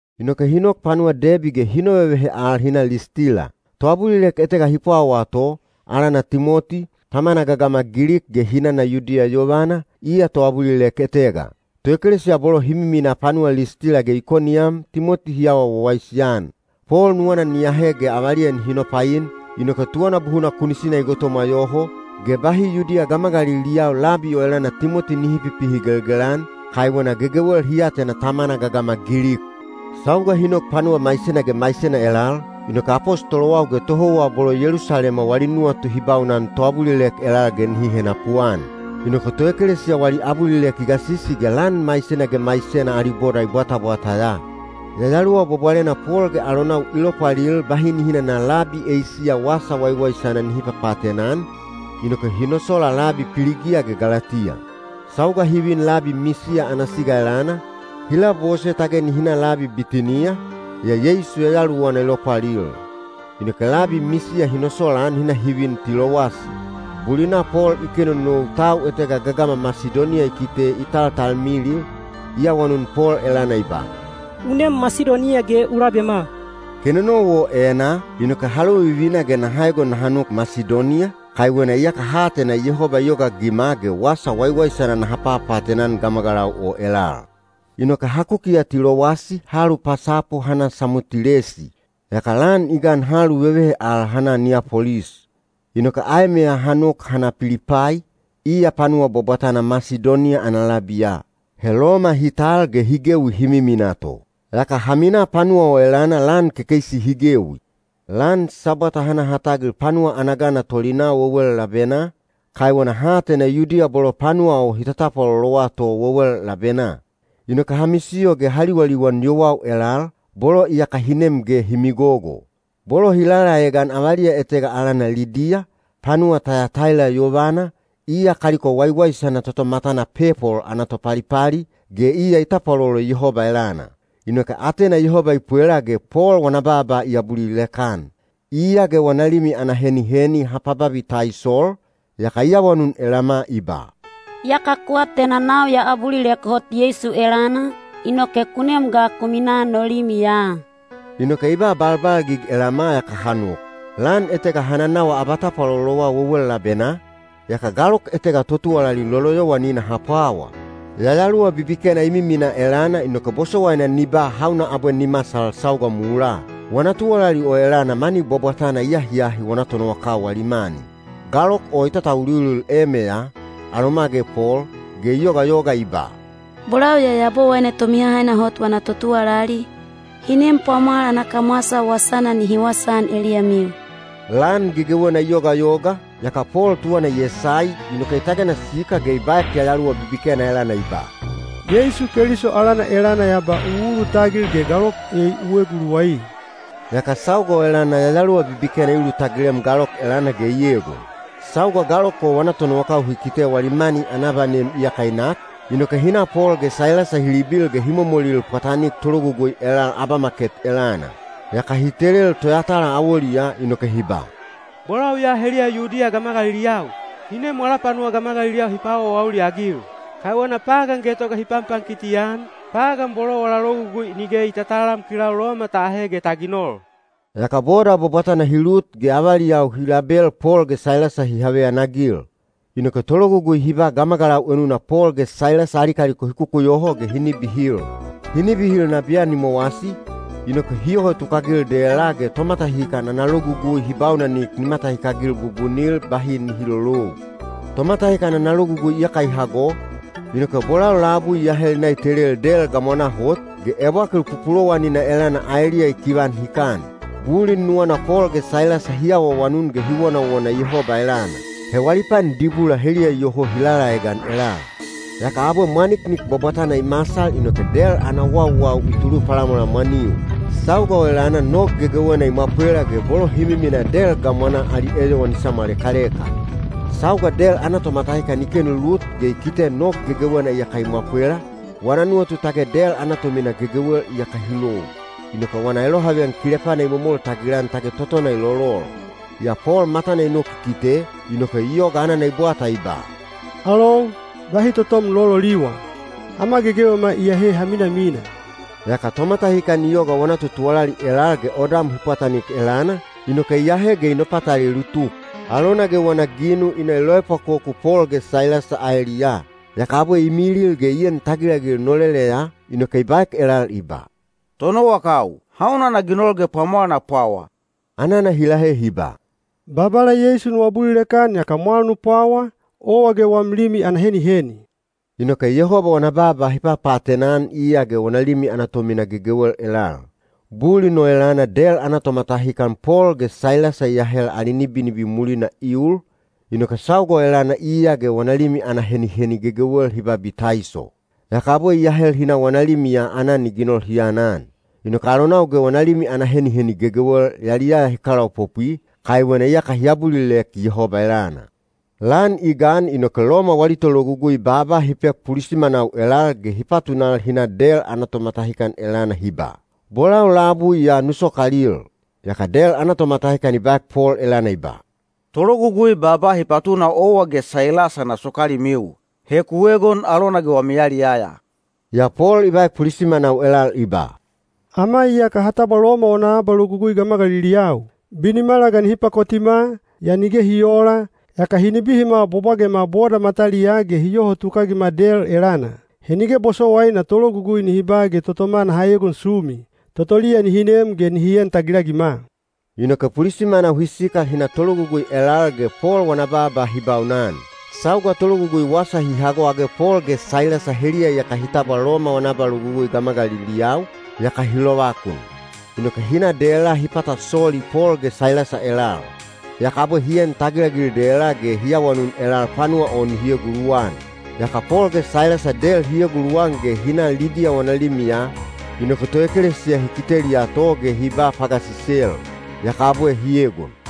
Inoke hi nok panuwa Debi ge hi novevehe al hi na Listila. Toabulilek etega hi pwawaa to, alana Timoti, tamana gagama Gilik ge hinana Yudiya yovana, iya toabulilek etega. Toekelesiya bolo hi miminaa panuwa Listila ge Ikoniyam Timoti hi awa wawaisi-an. Pol nuwana ni ahe ge avaliya nihi nopain, inoke tuwana buhuna kunisina i gotomwa yoho, ge bahi Yudiya gamagaliliyau labi o elana Timoti nihi pipihigelgel-an, kaiwena gegewel hi atena tamana gagama Gilik. Sauga hi nok panuwa maisena ge maisena elal, inoke apostolowau ge tohouwa bolo Yelusalema wali nuwatu hi baunan toabulilek elal ge nihi henapuan. Inoke toekelesiya wali abulilek i gasisi ge lan maisena ge maisena ali boda i bwatabwata ya. Yayaluwa Bwabwalena Pol ge alonau i lopwalil bahi nihi nana labi Eisiya wasa waiwaisana nihi papaatena-an, inoke hi nosola labi Piligiya ge Galatiya. Sauga hi vin labi Misiya ana siga elana, hi labose tage nihi na labi Bitiniya, yaa Yeisu Yayaluwana i lopwalil. Inoke labi Misiya hi nosolaan hi na hi vin Tilowasi. Bulina Pol i kenonou tau etega gagama Masidoniya i kite i taltalmilil, i awanun Pol elana i ba, “U nem Masidoniya ge u labema.” Kenonou o enaa, inoke ha lovivina ge naha egon naha nok Masidoniya, kaiwena iyaka ha atena Yehoba i yogaagima ge wasa waiwaisana naha papaatena-an gamagalau o elal. Inoke ha kukiya Tilowasi ha alupasapu ha na Samotilesi. Yaka lan i gan ha aluvevehe al ha na Niyapolis. Inoke aemeya ha nok ha na Pilipai, iya panuwa bwabwatana Masidoniya ana labiya. He Loma hi tal ge hi gewi hi miminaa to. Yaka ha minaa panuwa o elana lan kekeisi hi gewi. Lan Sabwata ha na ha tagil panuwa ana gana tolinaa wewel labenaa, kaiwena ha atena Yudiya bolo panuwa o hi tatapwalolowa to wewel labenaa. Inoke ha misiyo ge ha liwaliwan yowau elal, bolo iyaka hi nem ge hi migogo. Bolo hi lalaegan avaliya etega alana Lidiya, panuwa Tayataila yovana, iya kaliko waiwaisana toto matana pepol ana topalipali, ge iya i tapwalolo Yehoba elana. Inoke atena Yehoba i pwela ge Pol wana baaba i abulilek-an. Iya ge wana limi ana heniheni ha pababitaisol, yaka i awanun elama i ba, “Iyaka ku atena nau ya abulilek hot Yeisu elana, inoke ku nem ga ku minaa no limiya.” Inoke i ba balbalgig elama yaka ha nok. Lan etega ha nanawa abatapwalolowa wewel labenaa, yaka galok etega totuwalali loloyowanina ha pwawa. Yayaluwa bibikena i miminaa elana inoke bosowaina ni ba hauna abwe ni masal sauga mulaa. Wana tuwalali o elana mani bwabwatana i ahiahi wana tonowakau wali mani. Galok o i tatauliulil emeya, aloma ge Pol, ge i yogayoga i ba, “Bolau ya Yabowaine Tomihahaina Hot wana totuwalali, hi nem pwamwal ana kamwasa wasana nihi wasaan eliyamiu.” Lan gegewena i yogayoga, yaka Pol tuwana i esai, inoke i tagena sikal ge i baek yayaluwa bibikena elana i ba, “Yeisu Keliso alana elana ya ba u ulutagil ge galok ei u eguluwai.” Yaka sauga o elana yayaluwa bibikena i ulutagilem galok o elana ge i egon. Sauga galok o wana tonowakau hi kite wali mani ana abanem iyaka i nak, inoke hi na Pol ge Sailasa hi libil ge hi momolil pwatanik tologugui elal abamaket elana. Yaka hi telel toyatala awoliyaa inoke hi ba, “Bolau ya heliya Yudiya gamagaliliyau, hi nem wala panuwa gamagaliliyau hi paawaawauli-agil. Kaiwena pagan getoga hi panpankiti-an, pagan bolo wala logugui nige i tatalam kilau Loma ta ahe ge ta ginol.” Yaka boda bwabwatana hi lut ge avaliyau hi label Pol ge Sailasa hi haveyanagil. Inoke tologugui hi ba gamagalau enuna Pol ge Sailasa ali kaliko hi kukuyoho ge hi nibihil. Hi nibihil nabiyan i mowasi, inoke hi yoho tukagil dela ge tomatahikan ana logugui hi baunanik ni matahikagil bubunil bahi nihi lolou. Tomatahikan ana logugui iyaka i hago, inoke bolau labui i ahel i na i telel del gamwanaa hot, ge ebwakil pupulowanina elana aeliya i kivan hikan. Bulin nuwana Pol ge Sailasa hi awaawanun ge hi wonawona Yehoba elana. He wali pan dibula heliya iyoho hi lalaegan elal. Yaka abwe mwaniknik bwabwatana i masal inoke del ana wauwau i tulu palamwalamwaniu. Sauga o elana nog gegewena i mwapwela ge bolo hi miminaa del gamwanaa ali eyowan i samwalekaleka. Sauga del ana tomatahikan i kenu lut ge i kite nog gegewena iyaka i mwapwela, wana nuwatu tage del ana tomina gegewel iyaka hi lou. Inoke wana elohaveyan kilepana i momol tagilan tage totona i lolol. Yaa Pol matana i nok i kite, inoke i yoga anana i bwata i ba, “Alou, bahi totom nu lololiwa! Ama gegewema iyahe ha minamina.” Yaka tomatahikan i yoga wana totuwalali elal ge odam hi pwatanik elana, inoke i ahe ge i nopatalelu tuk. Alona ge wana ginu i na i loepwakoku Pol ge Sailasa aeliyaa. Yaka abwe i milil ge i en tagilagil noleleya, inoke i baek elal i ba, “Tonowakau, hauna na ginol ge pwamwal na pwawa?” Anana hi lahe hi ba, “Babala Yeisu nu abulilek-an yaka mwal nu pwawa, owa ge wam limi ana heniheni.” Inoke Yehoba wana baaba hi papaatena-an iya ge wana limi ana tomina gegewel elal. Bulin o elana del ana tomatahikan Pol ge Sailasa i ahel ali nibinibi mulina i ul, inoke sauga o elana iya ge wana limi ana heniheni gegewel hi babitaiso. Yaka abwe i ahel hi na wana limiya aanan i ginol hi anan. Inoke alonau ge wana limi ana heniheni gegewel yaliyaya hi kalaopopwi, kaiwena iyaka hi abulilek Yehoba elana. Lan i gan inoke Loma wali tologugui baaba hi pek pulisimanau elal ge hi patunal hi na del ana tomatahikan elana hi ba, “Bolau labui ya nu sokalil.” Yaka del ana tomatahikan i baek Pol elana i ba, “Tologugui baaba hi patuna owa ge Sailasa na sokalimiu. He ku egon alona ge wami yaliyaya.” Yaa Pol i baek pulisimanau elal i ba, “Ama iyaka ha tabwa Loma wana abalogugui gamagaliliyau. Binimala ga nihi pakotima, yaa nige hi oola, yaka hi nibihima bwabwagema boda mataliyaa ge hi yoho tukagima del elana. He nige bosowaina tologugui nihi ba ge totoma naha egon sumi. Totoliya nihi nem ge nihi en tagilagima.” Inoke pulisimanau hi sikal hi na tologugui elal ge Pol wana baaba hi baunan. Sauga tologugui wasa hi hago age Pol ge Sailasa heliya iyaka hi tabwa Loma wana abalogugui gamagaliliyau, yaka hi lovakun. Inoke hi na dela hi pata soli Pol ge Sailasa elal. Yaka abwe hi en tagilagil dela ge hi awanun elal panuwa o nihi eguluwan. Yaka Pol ge Sailasa del hi eguluwan ge hi na Lidiya wana limiya, inoke toekelesiya hi kiteliya to ge hi ba pagasisel. Yaka abwe hi egon.